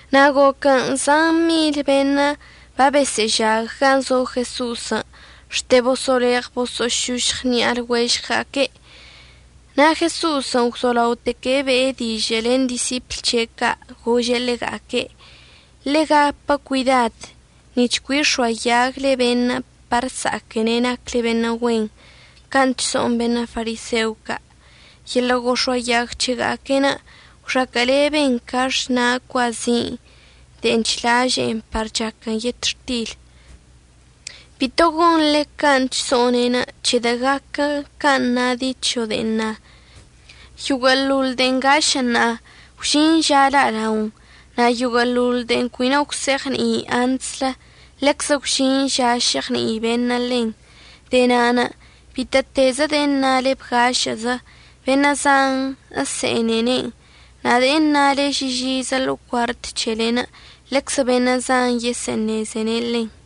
Na' goquən' zan mil beṉə' babesə'əžag gan' zo Jeso'osən' xte bosə'əleɉ bosə'əšošɉ ṉi'a lɉuežɉga'aque'. Na' Jeso'osən' gwzolaoteque' be'e dižə' len disipl c̱he' ca' gože' ḻega'aque': ―Ḻe'e gapə cuidad nic̱h cui əx̱oayagle beṉə' par əsa'aquene' nacle beṉə' güen can' chso'on beṉə' fariseo ca'. Yeḻə' gox̱oayag c̱hega'aque'enə' gwxaquə'əleben ca xna' cuazin' de'en chlažə'ən par chaquən yetxtil. Bito gonḻe can' chso'one'enə' c̱hedə' gaquə can' na dicho de'en na: “Yoguə'əḻoḻ de'en ngašə' ṉa'a gwžin ža la'alaon, na' yoguə'əḻoḻ de'en cui no gwse'eɉni'i antslə, ḻeczə gwžin ža se'eɉni'i beṉə' ḻen.” De'e na'anə' bitə'ətezə de'e əṉale bgašə'əzə, beṉə' zan əse'enene'en, na' de'en əṉale žižizə ḻo'o cuart c̱helen', ḻeczə beṉə' zan yesə'əṉeze ḻen.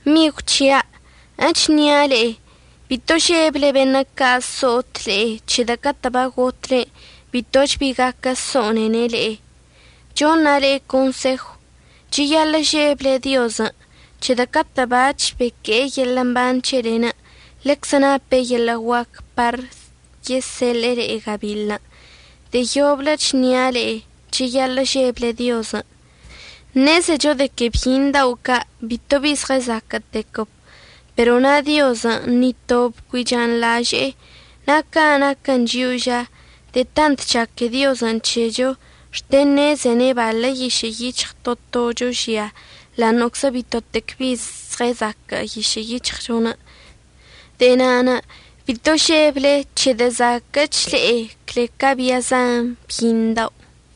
Migw c̱hia', əchnia' le'e, bito žeble beṉə' ca' əso'ot le'e, c̱hedə' catə' bagotle bitoch bi gaquə so'onene' le'e. Choṉa' le'e consejw, cheyaḻə' žeble Diozən' c̱hedə' catə' bac̱h beque'e yeḻə' mban c̱helen' ḻeczə nape' yeḻə' guaquən' par yeseḻe'e le'e gabiḻən'. De'e yoblə əchnia' le'e, cheyaḻə' žeble Diozən'. Ṉezecho de que byiṉ dao' ca' bitobi zɉəzaquə'ətequəb, pero na' Diozən' ni tob cui chanḻaže'e. Na' ca naquə chio'o ža, de'e tant chaque Diozən' c̱hecho xte ṉezene' baḻə yišə' yic̱hɉ to tocho žia ḻa'aṉə'əczə bitotec bi zɉəzaquə' yišə' yic̱hɉchon'. De'e na'anə' bito žeble c̱hedə' zaquə'əch le'e cle ca bia zan byiṉ dao'.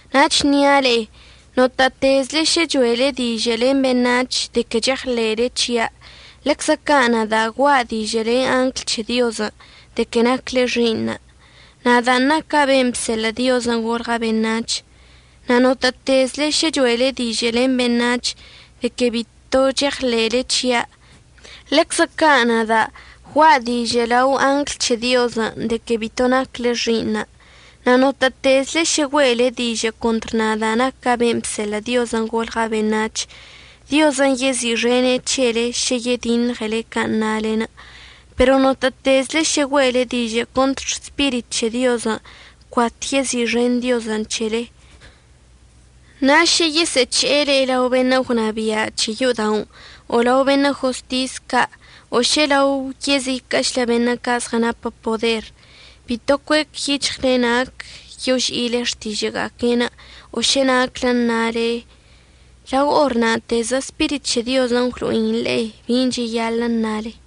Na' əchnia' le'e, notə'ətezle šə cho'ele dižə' len beṉac̱hən' de que cheɉḻe'ele c̱hia', ḻeczə ca' nada' gua'a dižə' len angl c̱he Diozən' de que nacle xi'iṉa', nadan' naca' ben' bseḻə' Diozən' golɉa' beṉac̱h. Na' notə'ətezle šə cho'ele dižə' len beṉac̱hən' de que bito cheɉḻe'ele c̱hia', ḻeczə ca' nada' gua'a dižə' lao angl c̱he Diozən' de que bito nacle xi'iṉa'. Na' notə'ətezle šə güe'ele dižə' contr nada' naca' ben' bseḻə' Diozən' golɉa' beṉac̱h, Diozən' yezi'ixene' c̱hele šə yediṉɉele can' nale. Pero notə'ətezle šə güe'ele dižə' contr Spirit c̱he Diozən', cuat yezi'ixen Diozən' c̱hele. Na' šə yesə'əc̱he'e le'e lao beṉə' gwnabia' c̱he yo'oda'onə' o lao beṉə' jostis ca' o šə lao yeziquə'əchlə beṉə' ca' zɉənapə poder, bito cuec yic̱hɉle nac yoži'ile xtižə'əga'aquen', o šə naclə əṉale. Lao or na'atezə Spirit c̱he Diozən' əgwlo'in le'e bin' cheyaḻə' əṉale.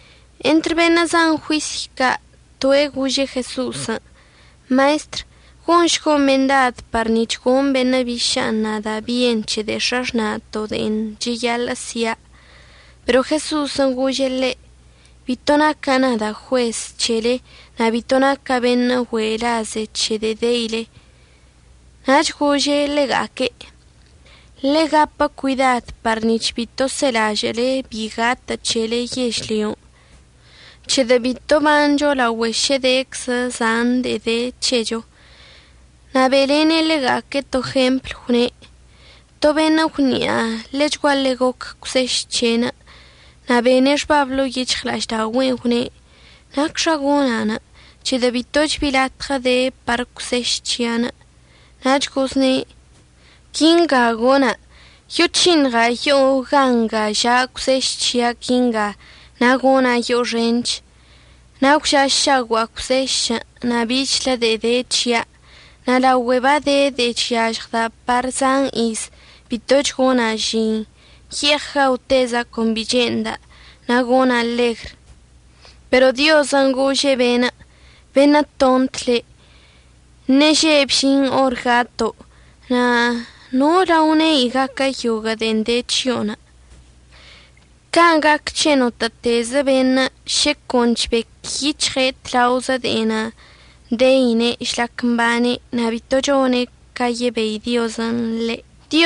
Entr beṉə' zan juisy ca' toe' gože' Jeso'osən': ―Maestr, gonšgo' mendad par nic̱h goṉ beṉə' biša'anə' nada' bien c̱he de'e x̱axna'ato' de'en cheyaḻə' si'a. Pero Jeso'osən' gože' ḻe': ―Bito naca' nada' juez c̱hele na' bito naca' beṉə' güe'e laze c̱he de'e deile. Nach gože' ḻega'aque': ―Ḻe'e gapə cuidad par nic̱h bito selažə'əle bi gatə' c̱hele yežlyon', c̱hedə' bito əbancho laogüe šə deczə zan de'e de c̱hecho. Na' be'elene' ḻega'aque' to jempl, gwne': ―To beṉə' gwni'a ḻechguaḻe goc cwseš c̱he'enə'. Na' bene' xbab ḻo'o yic̱hɉla'aždaogüe'en gwne': “¿Nacxa gona'? c̱hedə' bitoch bi latɉə de par cwseš c̱hia'anə'.” Nach gozne': “Quinga gona', yoc̱hiṉɉa' yo'o gan' nga ža' cwseš c̱hia' quinga na' gona' yo'o xench. Na' gwža'ašaogua'a cwsešən' na' bichlə de'e de c̱hia'. Na' laogüe bade de'e chyažɉda' par zan iz, bitoch gona' žin. Ye'eɉ gaoteza' con bi che'enda' na' gona' ḻegr.” Pero Diozən' gože' be'enə': “Beṉə' tont le'. Ṉeže' bžin or gato', na' ¿nola lao ne'i gaquə yoguə' de'en de c̱hio'onə'?” Can' gac c̱he notə'ətezə beṉə' šə con chbec yic̱hɉe' tlaozə de'en deine' žlac mbane' na' bito chone' ca yebei Diozən' ḻe'.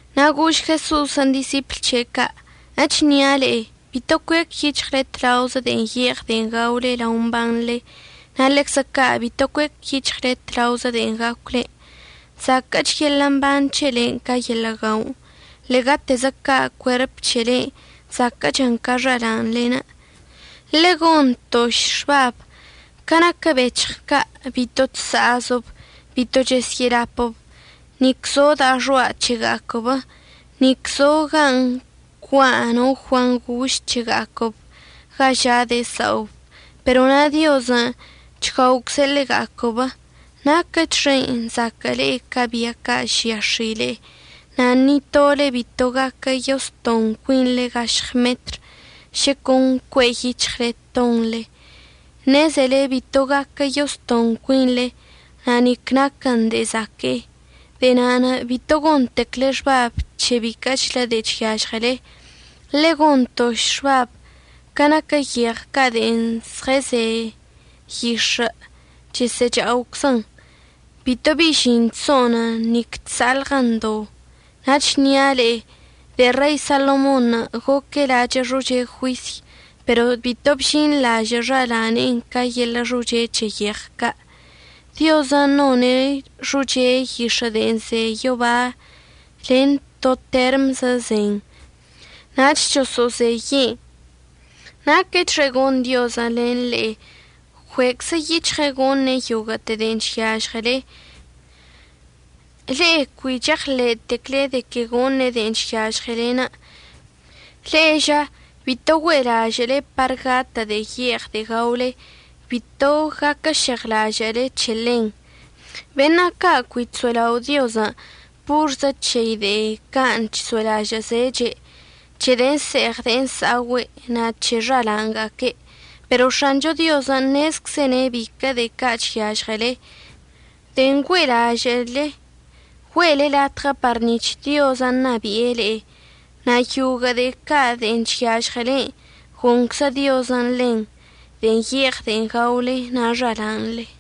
Na' gož Jeso'osən' disipl c̱he' ca': ―Echnia' le'e, bito cuec yic̱hɉle tlaozə de'en ye'eɉ de'en gaole lao mbanḻe. Na' ḻeczə ca' bito cuec yic̱hɉle tlaozə de'en gacwlen'. Zaquə'əch yeḻə' mban c̱helen' ca yeḻə' guaon'. Ḻe'egatezə ca' cuerp c̱helen' zaquə'əchən ca xala'anḻen'. Ḻegontoš xbab, ca naquə bec̱hɉ ca' bito chsa'azəb bito chəsyə'əlapəb, nic zo da'a xoa' c̱hega'aquəb, nic zo gan' ncua' no guangoš c̱hega'aquəb ga ža' de'e sa'ob. Pero na' Diozən' chguaocze' ḻega'aquəb. Naquəchxen' zaquə'əle ca bia ca' žia x̱ile'e. Na' ni tole bito gaquə yostoṉ cuinḻe gašɉ metr šə con cue'e yic̱hɉle ətoṉle. Ṉezele bito gaquə yostoṉ cuinḻe na' nic naquən de'e zaque'e. De'e na'anə' bito gontecle xbab c̱he biquə'əchlə de'e chyažɉele. Ḻegontoš xbab ca naquə yeɉ ca' de'en zɉəze yix̱ə' chesə'əcha'oczən. Bito bi žin chso'onən, nic chsa'alɉən do. Na' əchnia' le'e de'e Rei Salomonṉə' goque' lachə' xoche juisy, pero bito bžinḻaže'e xalane'enə' ca yeḻə' xoche c̱he yeɉ ca'. Diozən' none' xoche yix̱ə' de'en ze yoba len to termzən' zen nach choso'ozeye'en, naquəchxe gon Diozən' len le'e ggüe'eczə yic̱hɉe' goṉe' yoguə'əte de'en chyažɉele, le'e cui cheɉḻe'etecle de que goṉe' de'en chyažɉele. Le'e ža, bito güe'elažə'əle par gatə' de'e ye'eɉ de'e gaole. Bito gaquəžeɉlažə'əle c̱he ḻen. Beṉə' ca' cui chso'elao' Diozən' porzə c̱hei de'e can' chso'elažə'əzeche', c̱he de'en əse'eɉ de'en əsa'ogüe' na' c̱he xala'anga'aque'. Pero X̱acho Diozən' ṉezczene' biquə' de'e ca' chyažɉele. De'en güe'elažə'əle, güe'ele latɉə par nic̱h Diozən' ṉabi'e le'e. Na' yoguə' de'e ca' de'en chyažɉelen' goṉczə Diozən' ḻen, de'en ye'eɉ de'en gaole na' xala'anḻe.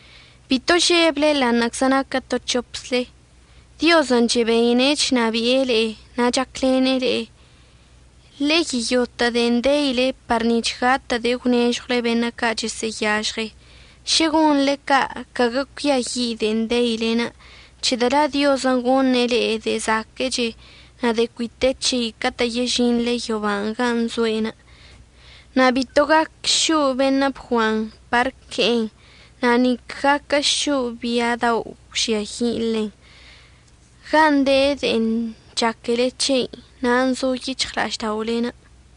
Bito žeble ḻa'aṉə'əczə naquə to c̱hopzle. Diozən' chebeine' chnabi'e le'e na' chaclene' le'e. Ḻe'e yeyotə' de'en deile par nic̱h gatə' de'e əgwnežɉwle beṉə' ca' chesə'əyažɉe. Šə gonḻe ca' caguə cuiayi' de'en deilen', c̱hedə' la' Diozən' goṉe' le'e de'e zaquə'əche na' de'e cui te c̱hei catə' yežinḻe yoban' gan' zo'enə'. Na' bito gac šo'o beṉə' bguan par əque'en, na' nique gaquə šo'o bia dao' əgwžiayi' ḻen. Gan' de de'en chaquele c̱hei, nan' zo yic̱hɉla'ažda'olen'.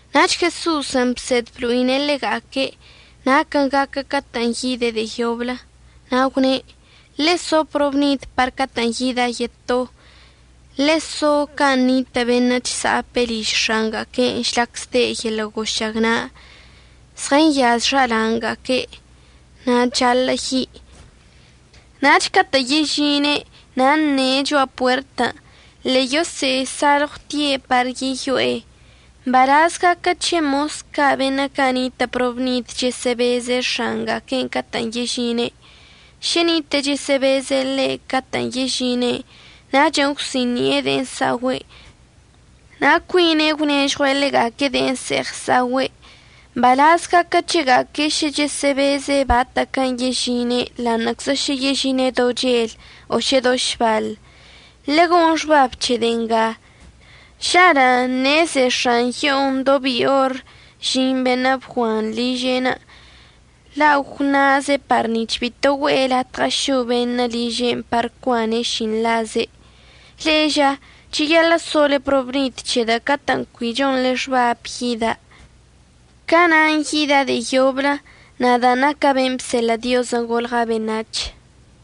Nach Jeso'osən' bsed blo'ine' ḻega'aque' naquən' gaquə catə'ən yide' de'e yoblə. Na' gwne': ―Ḻe'e so probnid par catə'ən yida' yeto, ḻe'e so can' nitə' beṉə' chsa'ape' liž x̱anga'aque' žlac zde' yeḻə' gošagna', zɉənyaze' xala'anga'aque' na' chaḻə' yi'. Nach catə' yežine' na' əṉe' cho'a puertən' ḻe'e yosə'əsalɉwtie' par yeyo'e. Mbalaz gaquə c̱he mos ca' beṉə' ca' nitə' probnid chəsə'əbezə x̱anga'aque'en catə'ən yežine'. Šə nite'e chəsə'əbeze' ḻe' catə'ən yežine', nachən' əgwsi'ini'e de'en əsa'ogüe' na' cuine' gwnežɉue' ḻega'aque' de'en əse'eɉ əsa'ogüe'. Mbalaz gaquə c̱hega'aque' šə chəsə'əbeze' batə'əquən' yežine' ḻa'aṉə'əczə šə yežine' do chel o šə do šbaḻ. Ḻegon xbab c̱he de'e nga. Žalə' ṉeze x̱an yo'onə' do bi or əžin beṉə' bguanṉə' liže'enə', la' gwṉaze' par nic̱h bito güe'e latɉə šo' be'enə' liže'enə' par cuane' šinḻaze'. Le'e ža, cheyaḻə' sole probnid, c̱hedə' catə'ən cui chonḻe xbab yida', ca na'an yida' de'e yoblə, nada' naca' ben' bseḻə' Diozən' golɉa' beṉac̱h.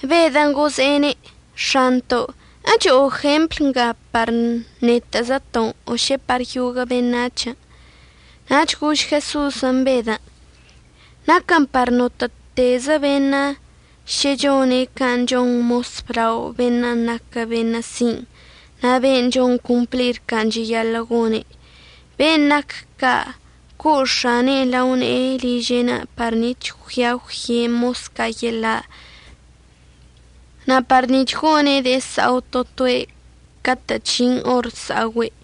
Bedən' gože'ene': ―X̱anto' ¿əcho'o jempl nga par netə'əzəto'onə' o šə par yoguə' beṉac̱hən'? Nach gož Jeso'osən' Bedən': ―Naquən par notə'ətezə beṉə' šə chone' can' chon mos əblao beṉə' naquə beṉə' sin' na' beṉə' chon complir can' cheyaḻə' gone'. Ben' nac ca' co' x̱ane'enə' lao ne'e liže'enə' par nic̱h əggüia əgwye' mos ca' yeḻa' na' par nic̱h ggone' de'e əsa'o to toe' catə' chžin or əsa'ogüe'.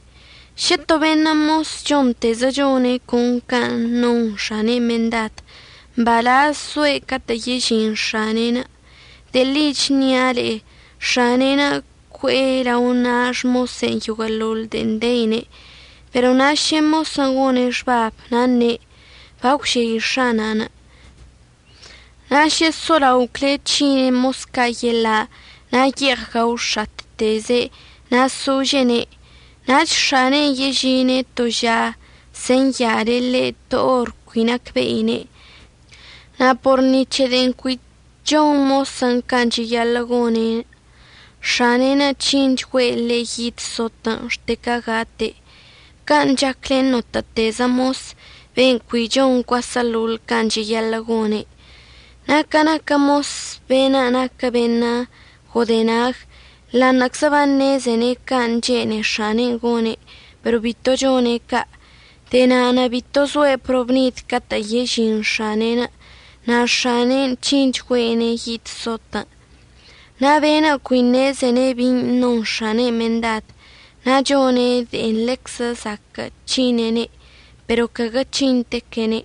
Šə to beṉə' mosən' chontezə chone' con can' non x̱anen' mendad, mbalaz soe' catə' yežin x̱ane'enə'. De'e ḻi əchnia' le'e x̱ane'en cue'e lao na' xmose'enə' yoguə'əḻoḻ de'en deine'. Pero na' šə mosən' gone' xbabən' na' əṉe': “Bagwžei x̱anan'”, na' šə solaocle' c̱hine' mos ca' yeḻa' na' ye'eɉ gaox̱atteze' na' sožene', nach x̱ane'enə' yežine' to ža senyale' ḻe' to or cui nacbe'ine'. Na' por ni c̱he de'en cui chon mosən' can' cheyaḻə' gone', x̱ane'enə' c̱hinchgüe' ḻe' yid sotən' xte ca gate'. Can' chac len notə'ətezə mos ben' cui chon cuaseḻoḻ can' cheyaḻə' gone'. Na' ca naquə mos beṉə' naquə beṉə' godenag, ḻa'aṉə'əczə baṉezene' can' chene'e x̱ane'enə' gone', pero bito chone' ca'. De'e na'anə' bito zoe' probnid catə' yežin x̱ane'enə', na' x̱ane'enə' c̱hinchgüe'ene' yid sotən'. Na' beṉə' cui ṉezene' bin' non x̱anen' mendad na' chone' de'e ḻeczə zaquə' c̱hine'ene', pero caguə c̱hintequene'.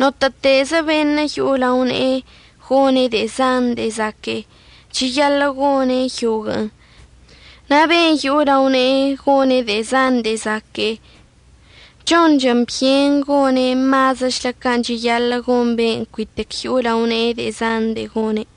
Notə'ətezə beṉə' yo'o lao ne'e gone' de'e zan de'e zaque'e, cheyaḻə' gone' yoguə'ən. Na' ben' yo'o lao ne'e gone' de'e zan de'e zaque'e, chonchən byen gone' mazəchlə can' cheyaḻə' gon ben' cuitec yo'o lao ne'e de'e zan de'e gone'.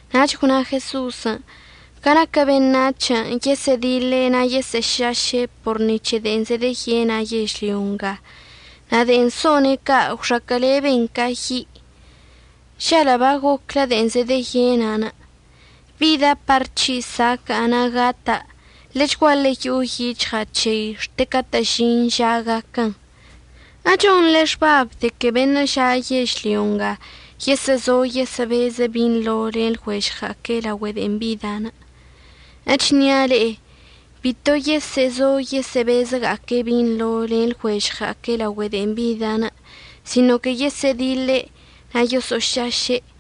Nach gwna Jeso'osən': ―Ca naquə beṉac̱hən' yesə'ədiḻe' na' yesə'əšaše' por ni c̱he de'en zedeyena' yežlyo nga, na' de'en so'one' ca' gwxaquə'əleben ca yi'. ¡Žalə' bagoclə de'en zedeyena'anə'! Bida' par c̱hi' saca'a na' gata'. Ḻechguaḻe yo'o yic̱hɉa' c̱hei xte catə'ən əžin ža gaquən. ¿Echonḻe xbabən' de que beṉə' ža' yežlyon' yesə'əzo yesə'əbeze' binḻo len lɉuežɉga'aque' laogüe de'en bida'? Echnia' le'e, bito yesə'əzo yesə'əbezəga'aque' binḻo len lɉuežɉga'aque' laogüe de'en bida', sino que yesə'ədiḻe' na' yoso'ošaše'.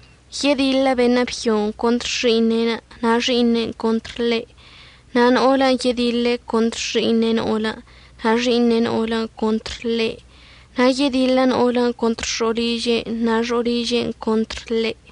Yediḻə beṉə' byon' contr xi'iṉe', na' xi'iṉe'en contr ḻe'. Na' no'olən' yediḻe' contr xi'iṉe' no'olə, na' xi'iṉe' no'olən' contr ḻe'enə'. Na' yediḻə no'olən' contr xo'oliže' na' xo'oliže'en contr ḻe'.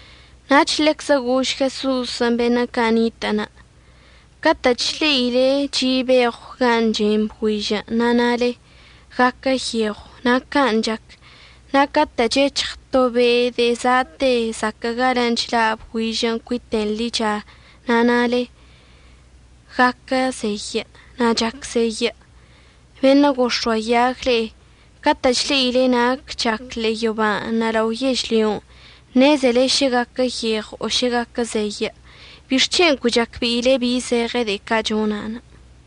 Nach ḻeczə gož Jeso'osən' beṉə' ca' nitə'ənə': ―Catə' chle'ile chi' beɉw gan' chen bgüižən' na' nale: “Guaquə yeɉw”, na' can' chac. Na' catə' chec̱hɉ to be' de'e za'ate zaquə' galən' chḻa' bgüižən' cuiten ḻicha, na' nale: “Guaquə zeyə'”, na' chac zeyə'. ¡Beṉə' gox̱oayag le'e! Catə' chle'ile nac chac ḻe'e yoban' na' lao yežlyon' ṉezele šə guaquə yeɉw o šə guaquə zeyə'. ¿Bixc̱hen' cui chacbe'ile bi zeɉe de'e ca' chona'?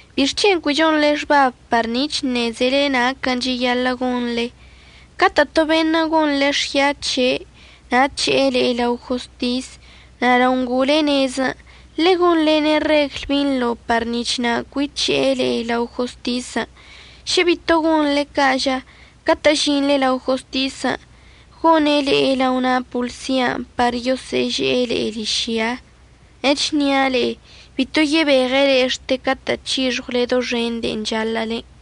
¿Bixc̱hen' cui chonḻe xbab par nic̱h əṉezele naquən' cheyaḻə' gonḻe? Catə' to beṉə' gonḻe xya c̱he' na' əc̱he'e le'e lao jostis, na' lao ngo'ole nezən' ḻegonḻene' regl binḻo par nic̱h na' cui c̱he'e le'e lao jostisən'. Šə bito gonḻe ca' ža, catə' əžinḻe lao jostisən' gone' le'e lao na' poḻsian' par yosə'əže'e le'e ližya. Echnia' le'e, bito yebeɉe' le'e xte catə' c̱hixɉwle doxen de'en chaḻə'əlen'.